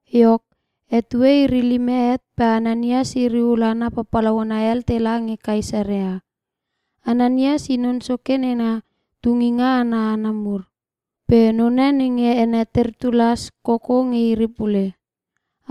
Iok, etue iri lime het pe Ananias iri ul hana papalauna hel tela nge Kaesarea. Ananias i non soke nenga tunginga ana hana mur. Pe none nge ene Tertulas koko nge iri pule.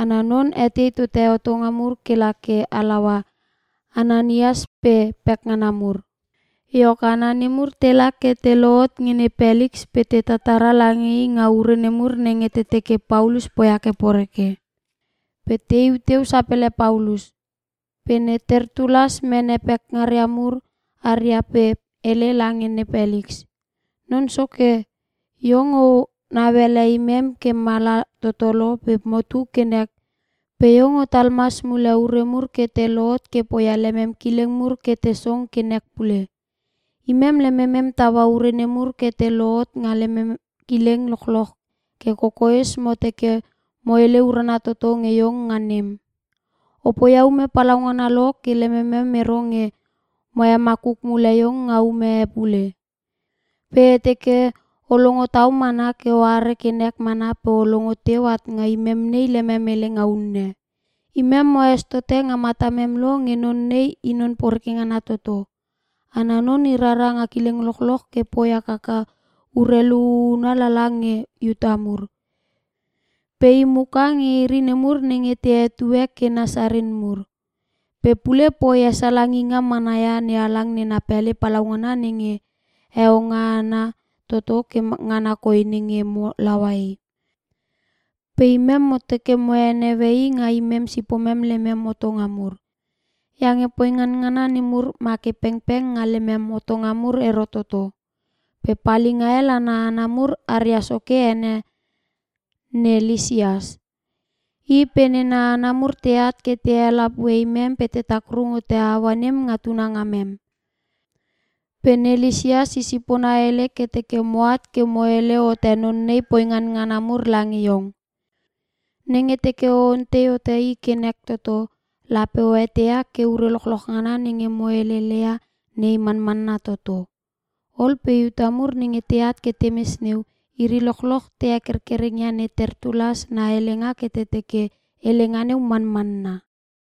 Ana non etei tote hotonga mur ke la ke halaua Ananias pe pekngana mur. Iok hana nemur tela ke te lohot nge Ne Peliks pe te tatara lange i nga ure nemur nenge te teke Paulus poia ke poreke. Pe teiu teu sapele Paulus. Pe ne Tertulas mene pekngaria mur haria pe hele lange ne Peliks, “Non Soke, iong o nauele imem ke mala toto lo pe motu ke nek pe mo iech mana. Pe iong otal mas mule ure mur ke te lohot ke poia lemem kileng mur ke te song ke nek pule. Imem lememem taua ure nemur ke te lohot nga lemem kileng lochloch ke kokoes mo teke mo hele urana toto nge iong nga nem. O poia ume palaungana lo ke lememem ero nge mo hemakuk mule iong nga ume e pule. Pe e teke o longo tau mana ke oare ke nek mana pe o longo teu at nga imem nei lemem helenga unne. “Imem moes tote nga matamem lo nge non nei i non poreke ngana toto. Ana non i rara nga kileng lochloch ke poi hakaka urelu huhuna lala nge Iuta mur. Pe i, imuka nge iri nemur nenge te hetue ke Nasarin mur. Pe pule poi hesalanginga mana ia NeHalang nena pele palaungana nenge heo ngana toto ke ngana koi nenge mo laua i. [Pe imem mo teke mo heneue i nga imem sipomem lemem hotonga mur. Iange poingan ngana nemur make pengpeng nga lemem hotonga mur ero toto. Pe palinga hel ana hana mur aria soke ene ne Lisias. I pe nena hana mur teat ke te helapue imem pe te takrung hote aua nem nga tuna ngamem. Pe ne Lisias i sipona hele ke teke moat ke mo hele hote non nei poingan ngana mur lange iong.] Nenge teke o ontei hote i ke nek toto, lape o eteia ke ure lochloch ngana nenge mo heleleia nei manmanna toto.” Ol pe Iuta mur nenge teat ke temes neu, iri lochloch te hekerkereng ia ne Tertulas na helenga ke te teke helenga neu manmanna.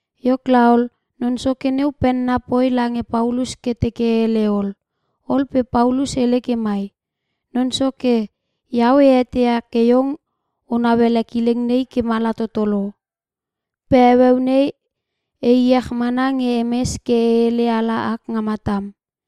Iok laol, non soke neu penna poi lange Paulus ke teke hele ol. Ol pe Paulus hele ke mai, “Non Soke, iau e eteia ke iong o nauele kileng nei ke mala toto lo. Pe heueu nei e iech mana nge e mes ke e hele ala ak nga matam.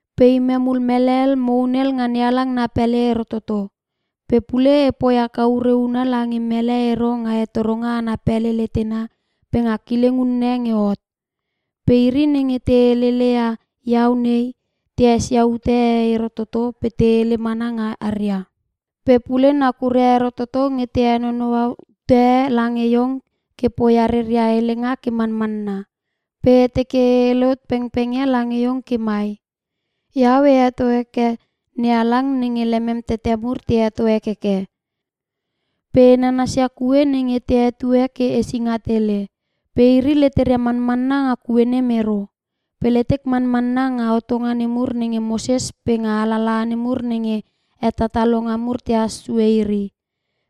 Pe imem ul mele hel mo hunel nga NeHalang na pele ero toto. Pe pule epoi haka ure huna lange mele ero nga hetoronga ana pele letena pe nga kileng unne nge hot. Pe iri nenge te helele ia iau nei, te esia ute e ero toto pe te hele mana nga haria. Pe pule, nakuria ero toto nge te henonoua ute e lange iong ke poia reria helenga ke manmanna. Pe e teke e hele hot pengpeng ia lange iong ke mai; Iau e heto heke NeHalang nenge lemem tete mur te heto hekeke. Pe e nanasia kue nenge te hetue ke Esinga Tele. Pe iri leteria manmanna nga kue nem ero. Pe letek manmanna nga hotonga nemur nenge Moses pe nga alalaha nemur nenge hetatalonga mur tehas sue iri.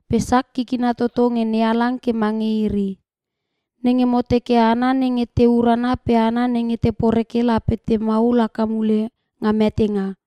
Pe sak kikina toto nge NeHalang ke mange iri; nenge mo teke hana nenge te urana pe hana nenge te poreke lape te maul haka mule nga metenga.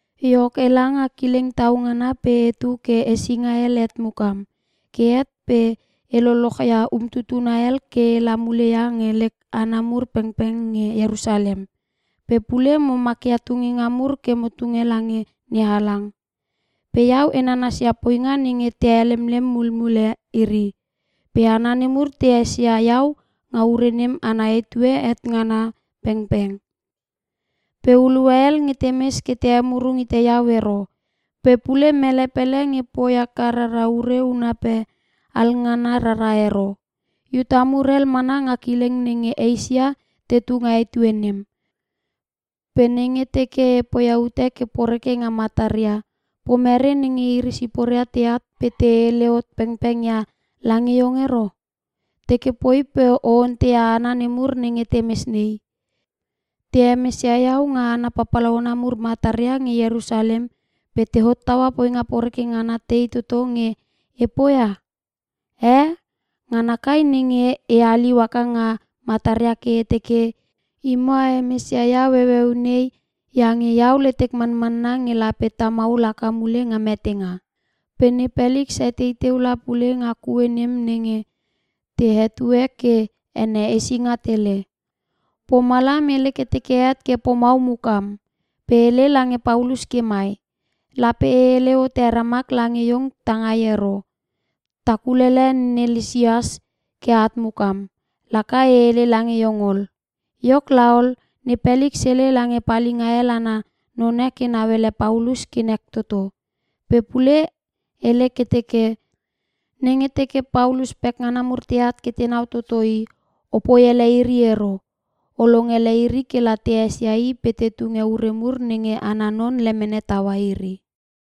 “Iok, ela nga kileng tau ngana pe etu ke hesinga hel het mukam, ke het pe e lolochia umtutuna hel ke ela mule ia nge lek hana mur pengpeng nge Ierusalem. Pe pule mo makia tunginga mur ke mo tunge lange NeHalang. Pe iau e nanasia poinga nenge te helemlem mulmule iri. Pe hana nemur te esia iau nga ure nem ana etue het ngana pengpeng. Pe hulua hel nge temes ke te emurung hite iau ero. Pe pule mele pele nge poi haka rara ure huna pe alngana rara ero. Iuta mur hel mana nga kileng nenge Eisia tetu nga etue nem. Pe nenge teke e poia ute ke poreke nga mataria, pomere nenge iri siporia teat pe te hele hot pengpeng ia lange iong ero? Teke poi pe o onteia hana nemur nenge temes nei. Te hemesia iau nga hana papalauna mur mataria nge Ierusalem pe te hottaua poinga poreke ngana tei toto nge e poia? Eh, ngana kai nenge e haliu haka nga mataria ke e teke, ‘Imo a hemesia iau heueu nei iange iau letek manmanna nge lape ta maul haka mule nga metenga.’” Pe ne Peliks etei teu la pule nga kue nem nenge te hetue ke ene Esinga Tele. Pomalam hele ke teke het ke pomau mukam. Pe hele lange Paulus ke mai, “Lape e hele hote ramak lange iong tangai ero. Ta kulele ne Lisias ke at mukam, laka e hele lange iong ol.” Iok laol, ne Peliks hele lange palinga hel ana none ke nauele Paulus ke nek toto. Pe pule hele ke teke, “Nenge teke Paulus pekngana mur teat ke tenau toto i, opoi ele iri ero. O longele iri kela te esia i pe te tunge ure mur nenge ana non lemene taua iri.”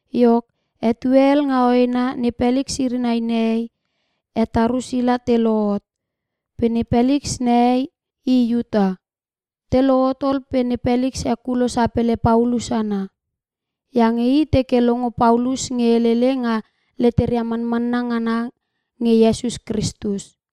Iok, etue hel nga hoena ne Peliks iri nai nehei, he Tarusila te lohot. Pe ne Peliks nehei i Iuta. Te lohot ol pe ne Peliks hekulo sapele Paulus ana. Iange i teke longo Paulus nge helele nga letera manmanna ngana nge Iesus Kristus.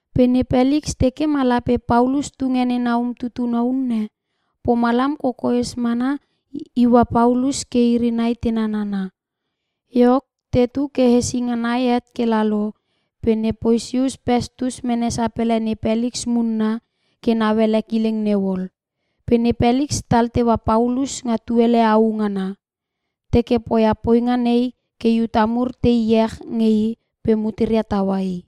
Pe ne Peliks teke ma lape Paulus tunge nena umtutuna unne, pomalam kokoes mana iua Paulus ke iri nai te nanana. Iok, tetu ke hesinga nai het ke lalo, pe ne Posius Pestus mene sapele ne Peliks munna ke nauele kileng neu ol. Pe ne Peliks tal teua Paulus nga tuele au ngana. Teke poia poinga nei ke Iuta mur te iech nge i pe muteria taua i.